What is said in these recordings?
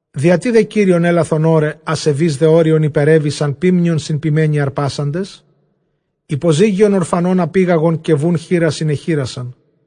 Διατί δὲ Κύριον ἔλαθον ὧραι, ἀσεβεῖς δὲ ὅριον ὑπερέβησαν, ποίμνιον σὺν ποιμένι ἁρπάσαντες; Ὑποζύγιον ὀρφανῶν ἀπήγαγον, καὶ βοῦν χήρας ἠνεχύρασαν.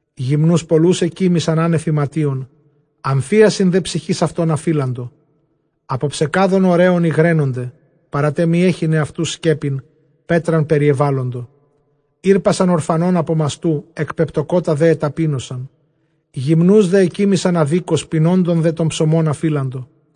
Γυμνοὺς πολλοὺς ἐκοίμισαν ἄνευ ἱματίων, ἀμφίασιν δὲ ψυχῆς αὐτῶν ἀφείλαντο. Ἀπὸ ψεκάδων ὀρέων ὑγραίνονται· παρὰ τὸ μὴ ἔχειν ἑαυτοὺς σκέπην, πέτραν περιεβάλοντο. Ἥρπασαν ὀρφανὸν ἀπὸ μαστοῦ, ἐκπεπτωκότα δὲ ἐταπείνωσαν· Γυμνοὺς δὲ ἐκοίμισαν ἀδίκως, πεινώντων δὲ τὸν ψωμὸν ἀφείλαντο.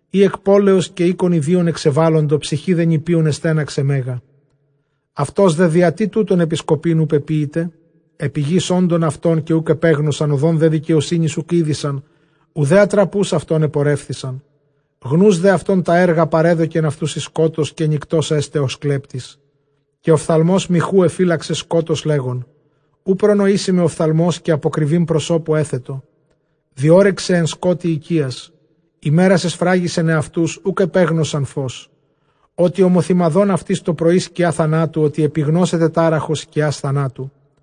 Οἳ ἐκ πόλεως καὶ οἴκων ἰδίων ἐξεβάλοντο, ψυχὴ δὲ νηπίων ἐστέναξε μέγα. Αὐτὸς δὲ διατί τούτων ἐπισκοπὴν οὐ πεποίηται; ἐπὶ γῆς ὄντων αὐτῶν καὶ οὐκ ἐπέγνωσαν, ὁδὸν δὲ δικαιοσύνης οὐκ ᾔδεισαν, οὐδὲ ἀτραποὺς αὐτῶν ἐπορεύθησαν. Γνοὺς δὲ αὐτῶν τὰ ἔργα, παρέδωκεν αὐτοὺς εἰς σκότος, καὶ νυκτὸς ἔσται ὡς κλέπτης. Καὶ ὀφθαλμὸς μοιχοῦ ἐφύλαξε σκότος, λέγων, οὐ προνοήσει με ὀφθαλμὸς, καὶ ἀποκρυβὴν προσώπου ἔθετο. Διώρυξεν ἐν σκότει οἰκίας, ἡμέρας ἐσφράγισαν ἑαυτοὺς, οὐκ ἐπέγνωσαν φῶς. Ὅτι ὁμοθυμαδὸν αὐτοῖς τὸ πρωῒ σκιὰ θανάτου, ὅτι ἐπιγνώσεται τάραχος σκιᾶς θανάτου.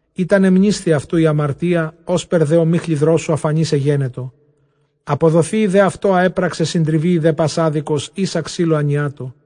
Εἶτʼ ἀνεμνήσθη αὐτοῦ ἡ ἁμαρτία· ὥσπερ δὲ ὁμίχλη δρόσου ἀφανὴς ἐγένετο· ἀποδοθείη δὲ αὐτῷ ἃ ἔπραξε, συντριβείη δὲ πᾶς ἄδικος ἶσα ξύλῳ ἀνιάτῳ.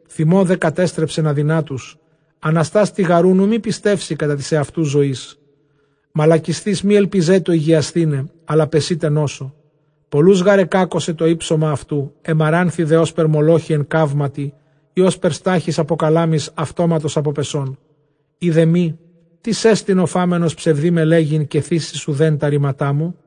Θυμῷ δὲ κατέστρεψεν ἀδυνάτους· ἀναστὰς τοιγαροῦν, οὐ μὴ πιστεύσῃ κατὰ τῆς ἑαυτοῦ ζωῆς. Μαλακισθεὶς, μὴ ἐλπιζέτω ὑγιασθῆναι, ἀλλὰ πεσεῖται νόσῳ. Πολλοὺς γὰρ ἐκάκωσε τὸ ὕψωμα αὐτοῦ, ἐμαράνθη δὲ ὥσπερ μολόχη ἐν καύματι, ἢ ὥσπερ στάχυς ἀπὸ καλάμης αὐτόματος ἀποπεσών. Εἰ δὲ μὴ, τίς ἐστιν ὁ φάμενος ψευδῆ με λέγειν, καὶ θήσει εἰς οὐδὲν τὰ ῥήματά μου;